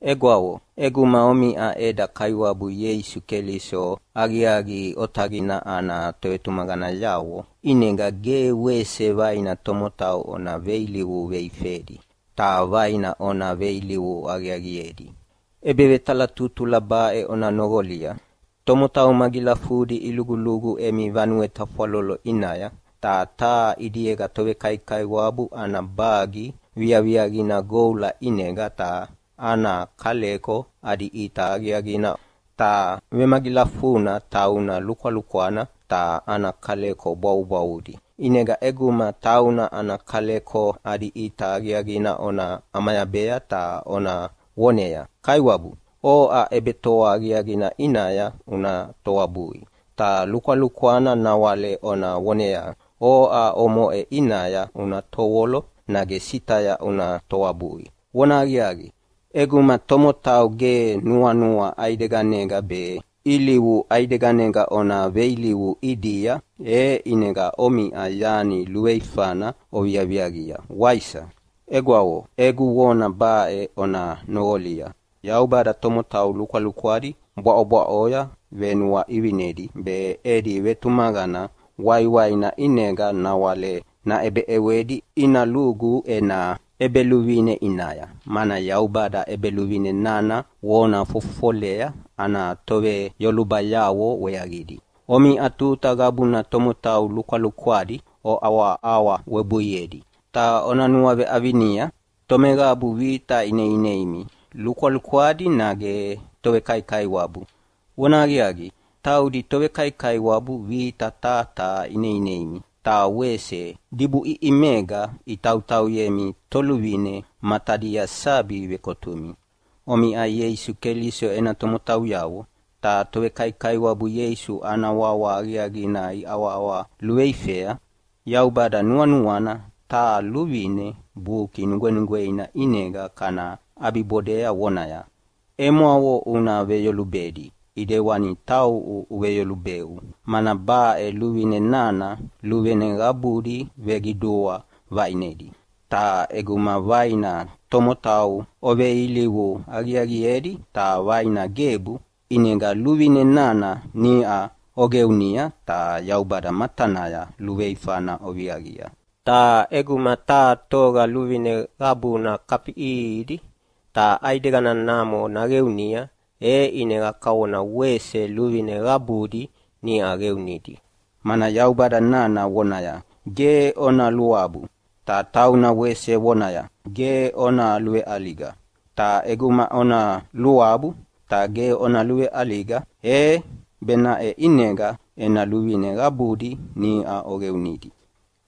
Egwavo, ʼeguma omiʼa eda Kaiwabu Ieisu Keliso aqiaqi otaqina ana tovetumaqanayavo, ʼinega ge wese vaina tomotau ona veilivu veifedi, ta vaina ona veilivu aqiaqiedi. ʼEbevetalatutula baʼe ona noqolia: Tomotau magilafudi ilugulugu emi vanue tafwalolo ʼinaya, ta taha ʼidiega tovekaikaiwabu ana bagi viaviaqina goula ʼinega ta ana kaleko adi ʼita aqiaqina, ta vemagilafuna tauna lukwalukwana ta ana kaleko bwavubwavudi. ʼInega ʼeguma tauna ana kaleko adi ʼita aqiaqina ona ʼamayabea ta ona voneaya, “Kaiwabu, oʼa ʼebetoa aqiaqina ʼinaya una toabui.” Ta lukwalukwana nawale ona voneaya, “Oʼa omoʼe ʼinaya una tovolo nage sitaya una toabui.” Vonahaqiaqi, ʼeguma tomotau ge nuanua ʼaideganega be ilivu ʼaideganega ona veilivu ʼidia, e ʼinega omiʼa yani luveifana oviaviaqia, waisa? Egwavo, egu vona baʼe ona noqolia. Yaubada tomotau lukwalukwadi bwaʼobwaʼoya venuaʼivinedi, be edi vetumaqana waiwaina ʼinega nawale naʼebeʼewedi ina lugu ena ʼEbeluvine ʼinaya, mana Yaubada ʼEbeluvine nana vona fofofolayea ana toveyolubayavo weaqidi. Omiʼa tuta qabuna tomotau lukwalukwadi oʼawaʼawa webuiedi. Ta ona nuaveʼavinia, tomeqabu vita ineineimi, lukwalukwadi nage tovekaikaiwabu? Vonahaqiaqi, taudi tovekaikaiwabu vita taha taha ineineimi, ta wese dibuʼiʼimega itautauyemi toluvine matadia sabi vekotumi. Omiʼa Ieisu Keliso ena tomotauyavo, ta tovekaikaiwabu Ieisu ana wawa aqiaqina iʼawaʼawa luveifea. Yaubada nuanuana taha luvine Buki Nugwenugweina ʼinega kana ʼabibodea vonaya, “Emwavo una veyolubedi ʼedewana tauʼu uveveyolubeu.” Mana baʼe luvine nana luvine qabudi veqidua vaʼinedi. Ta ʼeguma vaina tomotau oveilivu aqiaqiedi ta vaina gebu, ʼinega luvine nana niʼa oqeunia ta Yaubada matanaya luveifana oviaqia. Ta ʼeguma taha toga luvine qabuna kafiʼiʼihidi, ta ʼaideganamo naqeunia, e ʼinega kavona wese luvine qabudi niʼa qeunidi. Mana Yaubada nana vonaya, “Ge ona luabu!” Ta tauna wese vonaya, “Ge ona luveʼaliga!” Ta ʼeguma ona luabu ta ge ona luveʼaliga, e benaʼe ʼinega ena luvine qabudi niʼa oqeunidi.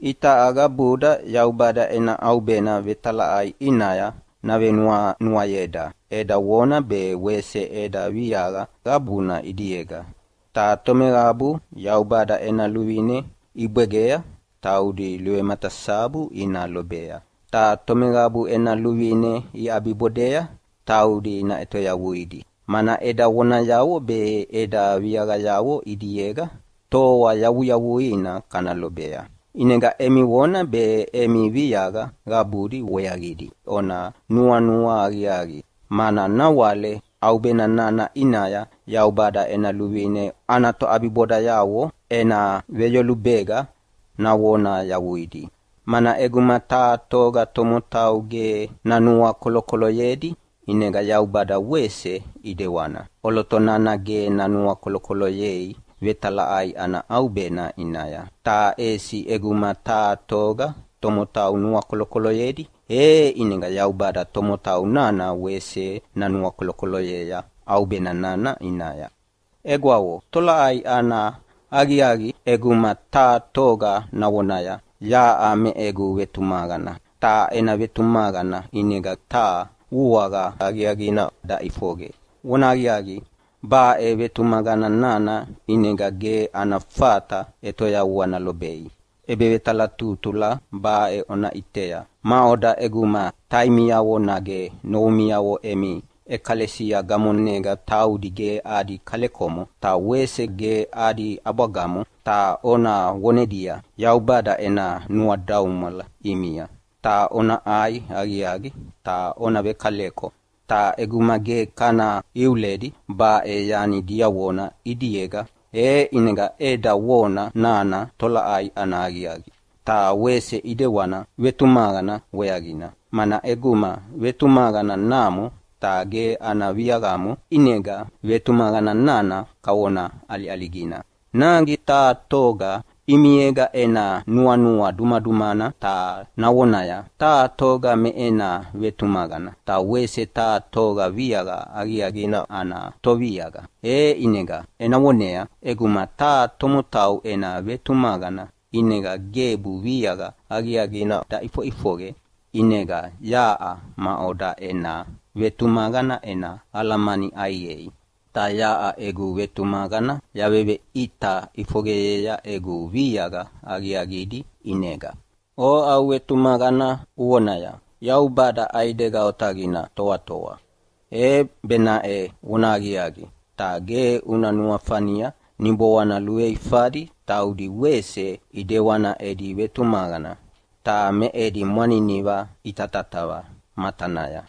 Itaʼa qabuda Yaubada ena ʼaubena vetalaʼai ʼinaya navenuanuayeda eda vona be wese eda viaqa qabuna ʼidiega. Ta tomeqabu Yaubada ena luvine ibwegea taudi luvematasabu ina lobea, ta tomeqabu ena luvine iʼabibodea taudi naʼetoyavuidi, mana eda vonayavo be eda viaqayavo ʼidiega toa yavuyavuina kana lobea. ʼInega emi vona be emi viaqa qabudi weaqidi ona nuanua aqiaqi, mana nawale ʼaubena nana ʼinaya Yaubada ena luvine ana toʼabibodayavo ena veyolubega navona yavuidi. Mana ʼeguma taha toga tomotau ge nanuakolokoloyedi ʼinega Yaubada wese ʼidewana ʼoloto nana ge nanuakolokoloyei vetalaʼai ana ʼaubena ʼinaya. Ta ʼesi ʼeguma taha toga tomotau nuakolokoloyedi e ʼinega Yaubada tomotau nana wese nanuakolokoloyea ʼaubena nana ʼinaya. Egwavo, tolaʼai ana aqiaqi ʼeguma taha toga navonaya, “Yaʼa me egu vetumaqana”, ta ena vetumaqana ʼinega ge taha vuaqa aqiaqina daʼifoqe? Vonahaqiaqi, baʼe vetumaqana nana ʼinega ge ana fata ʼetoyavua nalobei. ʼEbevetalatutula baʼe ona ʼitea: Maʼoda ʼeguma taimiavo nage novumiavo emi ʼekalesia gamonega taudi ge adi kalekomo ta wese ge adi ʼabwagamo, ta ona vonedia, “Yaubada ena nuadaumwala ʼimia, ta ona ʼai aqiaqi ta ona vekaleko.” Ta ʼeguma ge kana iuledi baʼe yani diavona ʼidiega, e ʼinega eda vona nana tolaʼai ana aqiaqi? Ta wese ʼidewana vetumaqana weaqina, mana ʼeguma vetumaqana namo ta ge ana viaqamo, ʼinega vetumaqana nana kavona ʼaliʼaligina. Nage taha toga ʼimiega ena nuanua dumadumana ta navonaya, “Taha toga me ena vetumaqana, ta wese taha toga viaqa aqiaqina ana toviaqa.” E ʼinega ena voneaya, “ʼEguma taha tomotau ena vetumaqana ʼinega gebu viaqa aqiaqina daʼifoʼifoqe, ʼinega yaʼa maʼoda ena vetumaqana ena alamani ʼaiqei?” Ta yaʼa egu vetumaqana yaveveʼita ʼifoqeyea egu viaqa aqiaqidi ʼinega. Oʼa uvetumaqana uvonaya, “Yaubada ʼaidega otaqina toatoa!” E benaʼe vonahaqiaqi, ta ge una nuafania niboana luveifadi taudi wese ʼidewana edi vetumaqana, ta me edi mwaniniva itatatava matanaya.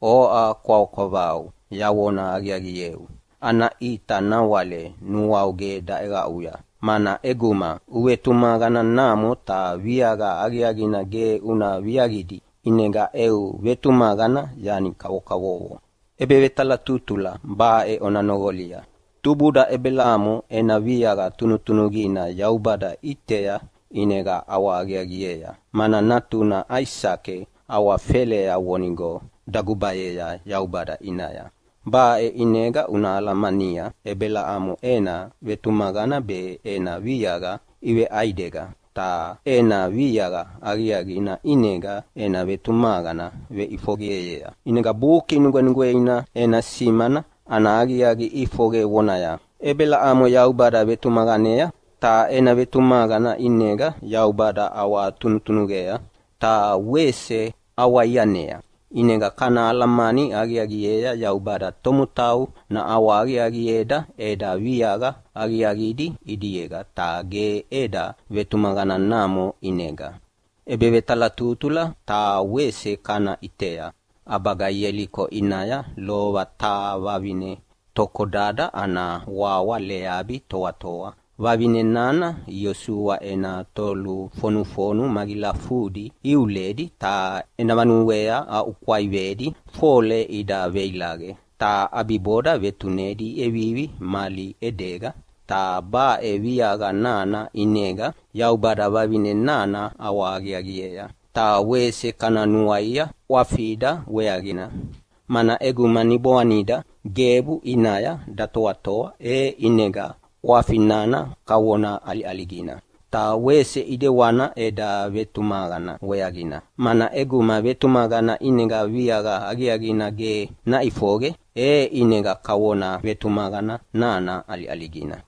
Oʼa kwavakwavau! Yavona aqiaqieu, ana ʼita nawale nuau ge daʼeqaʼuya, mana ʼeguma uvetumaqana namo ta viaqa aqiaqina ge una viaviaqidi, ʼinega eu vetumaqana yani kavokavovo. ʼEbevetalatutula baʼe ona noqolia: Tubuda Ebelamo ena viaqa tunutunuqina Yaubada ʼitea ʼinega ʼawahaqiaqiea, mana natuna Aisake awafelea vonigo dagubayea Yaubada ʼinaya. Baʼe ʼinega una alamania Ebelamo ena vetumaqana be ena viaqa iveʼaidega, ta ena viaqa aqiaqina ʼinega ena vetumaqana veʼifoqeyea. ʼInega Buki Nugwenugweina ena simana ana aqiaqi ʼifoqe vonaya, “Ebelamo Yaubada vetumaqanea, ta ena vetumaqana ʼinega Yaubada ʼawatunutunuqea.” Ta wese ʼawaianea, ʼinega kana alamani aqiaqiea Yaubada tomotau naʼawahaqiaqieda eda viaqa aqiaqidi ʼidiega ta ge eda vetumaqana namo ʼinega. ʼEbevetalatutula taha wese kana ʼitea: ʼAbaga Ieliko ʼinaya lova taha vavine tokodada ana wawa Leabi toatoa. Vavine nana Iosua ena tolufonufonu magilafudi iuledi ta ena vanuea aʼukwaivedi fole ida veilaqe, ta ʼabiboda vetunedi iʼevivi mali ʼedega. Ta baʼe viaqa nana ʼinega Yaubada vavine nana ʼawahaqiaqiea. Ta wese kana nuaia ʼwafida weaqina, mana ʼeguma niboanida gebu ʼinaya datoatoa e ʼinega ʼwafi nana kavona ʼaliʼaligina. Ta wese ʼidewana eda vetumaqana weaqina, mana ʼeguma vetumaqana ʼinega viaqa aqiaqina ge naʼifoqe e ʼinega kavona vetumaqana nana ʼaliʼaligina.